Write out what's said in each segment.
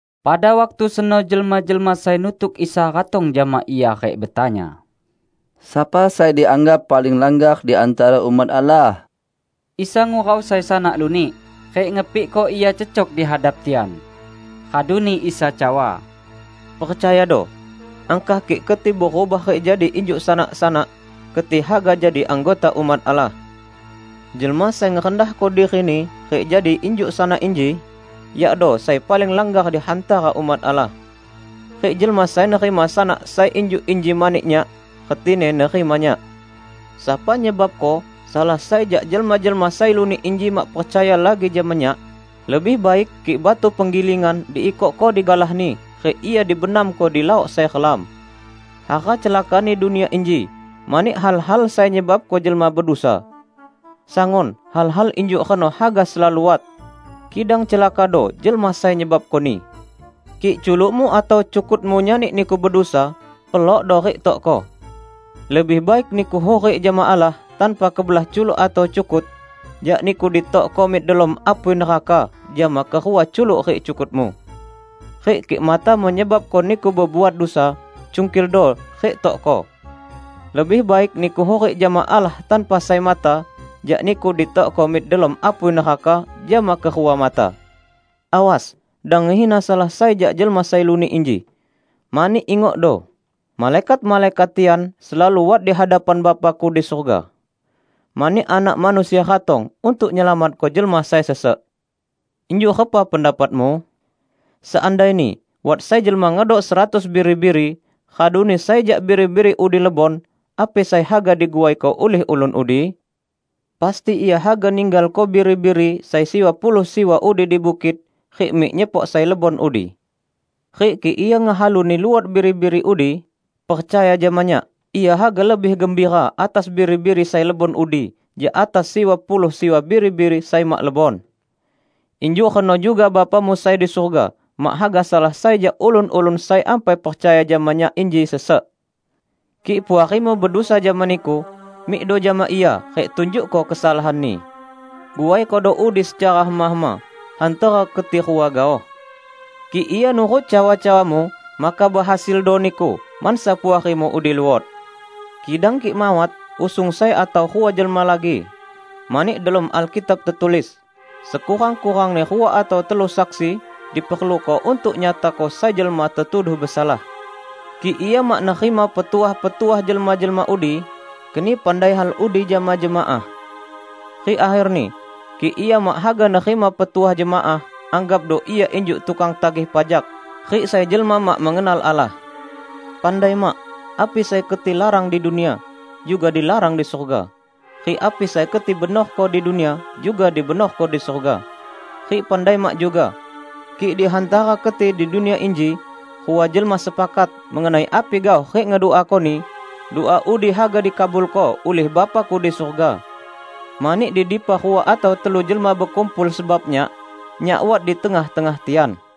Pada waktu seno jelma-jelma sai nutuk Isa ratong jama Ia rik betanya, "Sapa sai dianggap paling langgar di hantara umat Allah?" Isa ngurau sai sanak lunik, rik ngepikko ia cecok di hadap tian. Raduni Isa cawa, "Percayado! Angkah kik keti berubah rik jadi injuk sanak-sanak, keti haga jadi anggota umat Allah. Jelma sai ngerendahko dirini rik jadi injuk sanak inji, yakdo sai paling langgar di hantara umat Allah. Rik jelma sai nerima sanak sai injuk inji mani Nyak, retini nerima Nyak." "Sapa nyebabko salah sai jak jelma-jelma sai lunik inji mak percaya lagi jama Nyak, lebih baik kik batu penggilingan diikokko digalahni rik ia dibenamko di laok sai relam. Hara celakani dunia inji mani hal-hal sai nyebabko jelma bedusa. Sangun hal-hal injuk reno haga selalu wat, kidang celakado jelma sai nyebabkoni! Kik culukmu atau cukutmu nyani niku bedusa, pelokdo rik tokko. Lebih baik niku hurik jama Allah tanpa kebelah culuk atau cukut, jak niku ditokko mik delom apui neraka jama kerua culuk rik cukutmu. Rik kik matamu nyebabko niku bebuat dusa, cungkildo rik tokko. Lebih baik niku hurik jama Allah tanpa sai mata jak niku ditokko mik delom apui neraka jama kerua mata." "Awas! Dang ngehina salah sai jak jelma sai lunik inji. Mani, ingokdo, malaikat-malaikat tian selalu wat di hadapan Bapa-Ku di surga. [ Mani Anak Manusia ratong untuk nyelamatko jelma sai sesek!] Injuk repa pendapatmu? Seandaini wat sai jelma ngedok seratus biri-biri, raduni sai jak biri-biri udi lebon, api sai haga diguaiko ulih ulun udi? Pasti ia haga ninggalko biri-biri sai siwa puluh siwa udi di bukit rik mik nyepok sai lebon udi. Rik kik ia ngehaluni luot biri-biri udi -- percaya jama Nyak -- ia haga lebih gembira atas biri-biri sai lebon udi jak atas siwa puluh siwa biri-biri sai mak lebon. Injuk reno juga Bapamu sai di surga mak haga salah sai jak ulun-ulun sai ampai percaya jama Nyak inji sesek." "Kik puarimu bedusa jama niku, mikdo jama ia rik tunjukko kesalahanni. Guaikodo udi secara hema-hema hantara keti rua gaoh. Kik ia nurut cawa-cawamu, maka behasildo niku mansa puarimu udi luot. Kidang kik mawat, usung sai atau rua jelma lagi. Mani delom Alkitab tetulis, 'Sekurang-kurangni rua atau telu saksi diperluko untuk nyatako sai jelma tetuduh besalah.' Kik ia mak nerima petuah-petuah jelma-jelma udi, keni pandai hal udi jama jemaah. Rik akherni, kik ia mak haga nerima petuah jemaah, anggapdo ia injuk tukang tagih pajak rik sai jelma mak mengenal Allah." "Pandai mak: Api sai keti larang di dunia, juga dilarang di surga. Rik api sai keti benorko di dunia, juga dibenorko di surga. Rik pandai mak juga: Kik di hantara keti di dunia inji rua jelma sepakat mengenai api gaoh rik ngeduakoni, dua udi haga dikabulko ulih Bapa-Ku di surga. Mani di dipa rua atau telu jelma bekumpul sebab Nyak, Nyak wat di tengah-tengah tian."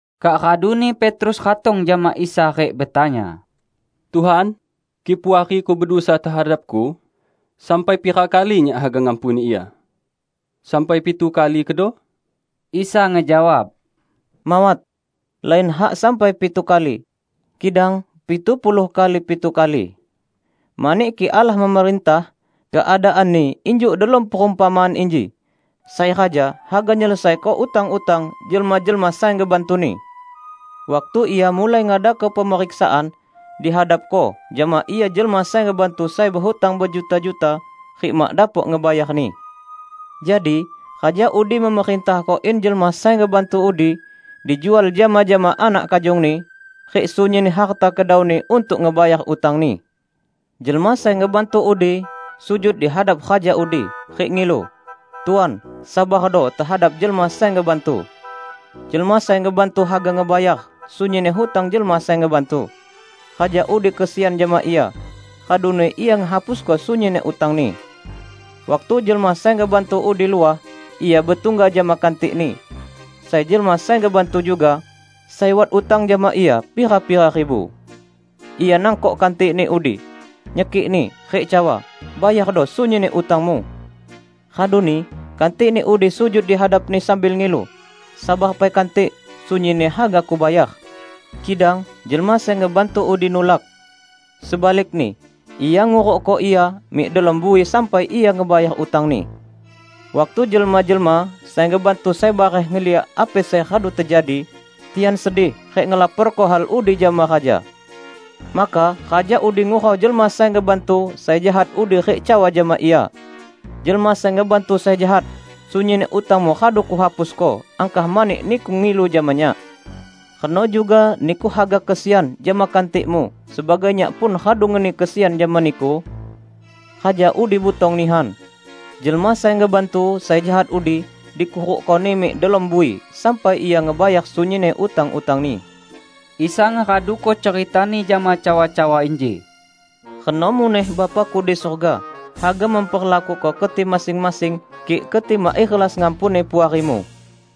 Kak raduni Petrus ratong jama Isa rik betanya, "Tuhan, kik puariku bedusa tehadapku, sampai pira kali nyak haga ngampuni ia? Sampai pitu kali kedo?" Isa ngejawab, "Mawat, lain hak sampai pitu kali, kidang pitu puluh kali pitu kali! Mani kik Allah memerintah, keadaanni injuk delom perumpamaan inji: Sai raja haga nyelesaiko utang-utang jelma-jelma sai ngebantuni. Waktu ia mulai ngadako pemeriksaan, dihadapko jama ia jelma sai ngebantu sai behutang bejuta-juta, rik mak dapok ngebayarni. Jadi, raja udi memerintahko in jelma sai ngebantu udi dijual jama-jama anak kajongni, rik sunyinni harta kedauni untuk ngebayar utangni. Jelma sai ngebantu udi sujud dihadap raja udi, rik ngilu, 'Tuan, sabardo tehadap jelma sai ngebantu. Jelma sai ngebantu haga ngebayar sunyinni hutang jelma sai ngebantu.' Raja udi kesian jama ia, raduni ia ngehapusko sunyinni utangni. Waktu jelma sai ngebantu udi luah, ia betungga jama kantikni, sai jelma sai ngebantu juga, sai wat utang jama ia pira-pira ribu. Ia nangkok kantikni udi, nyekikni, rik cawa, 'Bayardo sunyinni utangmu!' Raduni kantikni udi sujud dihadapni sambil ngilu, 'Sabar pai kantik, sunyinni haga kubayar!' Kidang jelma sai ngebantu udi nulak. Sebalikni, ia ngurukko ia mik delom bui sampai ia ngebayar utangni. Waktu jelma-jelma sai ngebantu sai bareh ngeliak api sai radu tejadi, tian sedih rik ngelaporko hal udi jama raja. Maka raja udi ngurau jelma sai ngebantu sai jahat udi rik cawa jama ia, 'Jelma sai ngebantu sai jahat! Sunyinni utangmu radu kuhapusko angkah mani niku ngilu jama nyak. Reno juga niku haga kesian jama kantikmu sebagai nyak pun radu ngeni kesian jama niku?' Raja udi butong nihan. Jelma sai ngebantu sai jahat udi dikurukkoni mik delom bui sampai ia ngebayar sunyinni utang-utangni." Isa ngeraduko cerita-Ni jama cawa-cawa inji, "Reno muneh Bapa-Ku di surga haga memperlakuko keti masing-masing, kik keti mak ikhlas ngampuni puarimu."